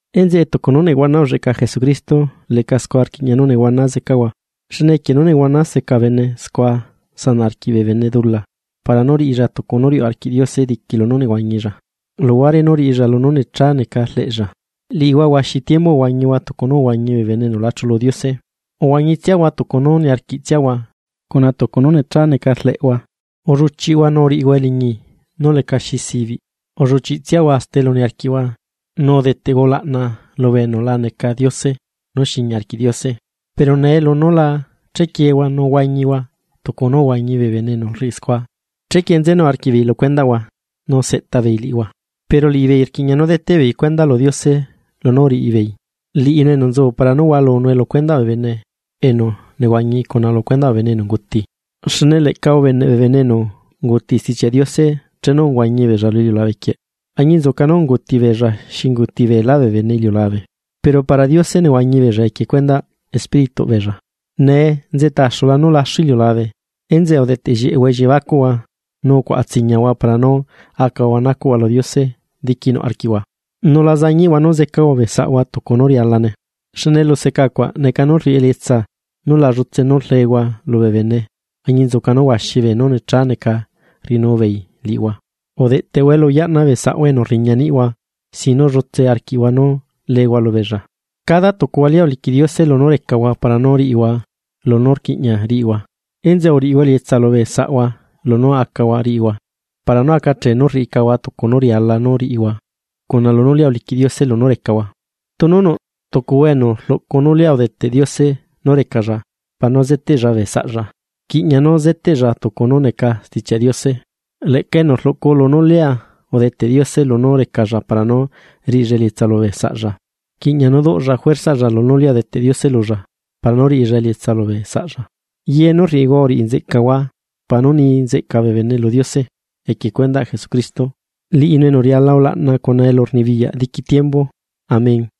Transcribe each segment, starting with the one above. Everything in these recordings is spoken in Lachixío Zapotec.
Enzeꞌe tucu nú nehuana ulleꞌca Jesucristo, leꞌca scua rquiꞌña nú nehuana zecahua. Xne equie nú nehuana zeca bene scua sanaꞌ arquiꞌ bene bee dula, para nú riꞌilla tucu nú riuꞌ arquiꞌ Diose diqui lunú nehuañilla, luhuare nú riꞌilla lunú necha neca rleꞌlla. Liꞌihua huaxi tiembu uhuañihua tucu nú uhuañi bee bene enu la chulu Diose. Uhuañitsiahua tucu nú niarquiꞌtsiahua cuna tucu nú necha neca rleꞌhua, ulluchiꞌhua nu uriꞌihua eliñi nú lecaxi zibiꞌ, ulluchiꞌtsiahua hasta elu niarquiꞌhua, nu udeteꞌhua ulaꞌna lu beenú la neca diose nú xiña arquiꞌ Diose. Pero nee lunú la chequiehua nú huañihua tucu nú uhuañi bee bene enu rriꞌi scua, chequie nzenu arquiꞌbeei lu cuendaꞌhua nu seꞌta beei liꞌihua. Pero liꞌibeei rquiꞌña nú deteꞌbeei cuenda lu Diose lunú uriꞌibeei, liꞌinu enu nzu para nú hualue lu cuendaꞌ bee bene enu nehuañi cuna lu cuendaꞌ bee bene enu unguti. Xne leꞌca ubeneꞌ bee bene enu unguti Stichiaꞌ Diose chenu uhuañi beella lu iliulabe quieꞌ, añinzuca nú unguti beella xi unguti beelá bee bene iliulabe, pero para Diose nehuañi beella equie cuendaꞌ espírituꞌ beella. Nee nzeꞌta axula nú laxu iliulabe. Enzeꞌe udeꞌteꞌ llieꞌehua elliebacuꞌhua nu ucuaꞌa tsiñiahua para nú acahua nacuꞌhua lu Diose diquinuꞌ arquiꞌhua. Nu la zañiꞌhua nú zecahua bee saꞌhua tucu nú rialane, xne eluseca cuaꞌ neca nú rriꞌi elietsa nu la ducheꞌhua liñi arquiꞌhua nú rlehua lubee bene añinzuca nú huaxi beenú necha neca rriꞌinu beei liꞌihua. Udeꞌtehua elu yaꞌna bee saꞌhua enu rriña niꞌhua sin nú leehua lubeella. Cada tucuhua lia uliquiꞌ Diose lunú recahua para nú riꞌihua lunú rquiꞌña riꞌihua, enzeꞌe uriꞌihua elietsa lubee saꞌhua lunú acahua riꞌihua para nú acachee nú rriꞌicahua tucu nú riala nú riꞌihua cuna lunú lia uliquiꞌ Diose lunú recahua. Tunu nuꞌ tucuhua enu rluꞌcu nú lia udeteꞌ Diose nú recalla para nú zeteꞌlla bee saꞌlla, rquiꞌña nú zeteꞌlla tucu nú neca Stichiaꞌ Diose. Leꞌca enu rluꞌcu lunú lia udeteꞌ Diose lunú recalla para nú riꞌilla elietsa lubee saꞌlla, rquiꞌña nú duꞌlla juerzaꞌlla lunú lia udeteꞌ Diose lulla para nú riꞌilla elietsa lubee saꞌlla. Ye nú rriꞌihua uriꞌi nzeꞌcahua para nú ni nzeꞌca bee bene lu Diose equie cuendaꞌ Jesucristo, liꞌinu enu riala ulaꞌna cuna elurnibiyaꞌ diqui tiembu. Amén.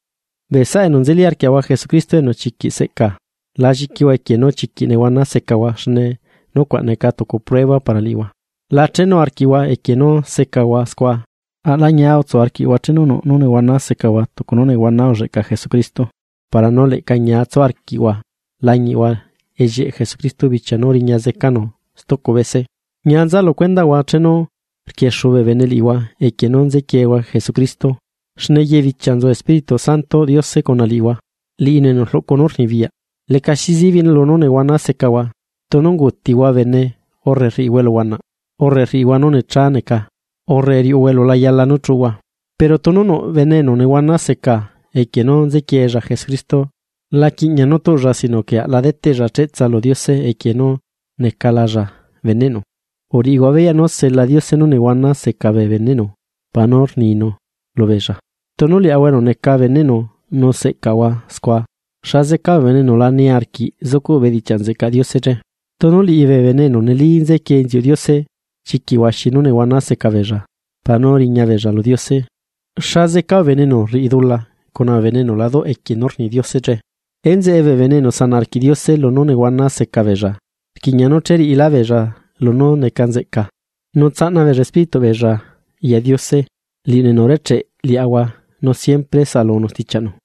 Bee saꞌa enu nzeli arquiaꞌahua Jesucristo enu chiquiꞌ seꞌca, la lliquihua equie nú chiquiꞌ nehuana secahua xne nucuaꞌ neca tucu prueba para liꞌihua, la chenu arquiꞌhua equie nú secahua scua. Aꞌla ñia utsu arquiꞌhua chenu nuꞌ nú nehuana secahua tucu nú nehuana ulleꞌca Jesucristo para nú leꞌca ñia tsu arquiꞌhua lañiꞌhua ellieꞌ Jesucristo bichia nú riña zecanu stucu bese. Ñia nza lu cuendaꞌhua chenu rquiexu bee bene liꞌihua equie nú nzequiehua Jesucristo, xne ye bichia nzu Espíritu Santoꞌ Diose cuna liꞌihua. Liꞌinu enu rluꞌcu nú rnibiyaꞌ. Lecaxi zibiꞌ nú nehuana secahua, tunu unguutihua bene urre rriꞌihua eluhuanaꞌ, urre rriꞌihua nú necha neca, urre riuꞌuhua elu la yala nú chuꞌuhua. Pero tunu nuꞌ bene enu nehuana seca equie nú nzequiella Jesucristo, la yala nú tuꞌlla sino que aꞌla deteꞌlla cheꞌtsa lu Diose equie nú necalalla beneꞌnu. Uriꞌihua beyaꞌ nú sela Diose nú nehuana seca bee beneꞌnu para nú ninu lubeella, tunu liaꞌahua nú necaꞌahua beneꞌnu nu seꞌcaꞌahua scua, ¿xa zeca bee bene enu la niarquiꞌ zucuꞌ bedichiaꞌ nzeꞌcaꞌ Diose che? Tunu liꞌi bee bene enu neli nzequie inziuꞌ Diose chiquiꞌ huaxi nú nehuana zeca beella para nú riña beella lu Diose, ¿xa zeca bee bene enu rriꞌi dula cuna bee enu la duꞌ equie nú rni Diose che? Enzeꞌe bee bene enu sanaꞌ arquiꞌ Diose lunú nehuana seca beella, rquiꞌña nú che riꞌilá beella lunú neca nzeꞌca, nu tsaꞌna beella espírituꞌ beella ya Diose, liꞌinu enu urecheꞌe liaꞌahua nu siempre saꞌalunu stichiaꞌnu.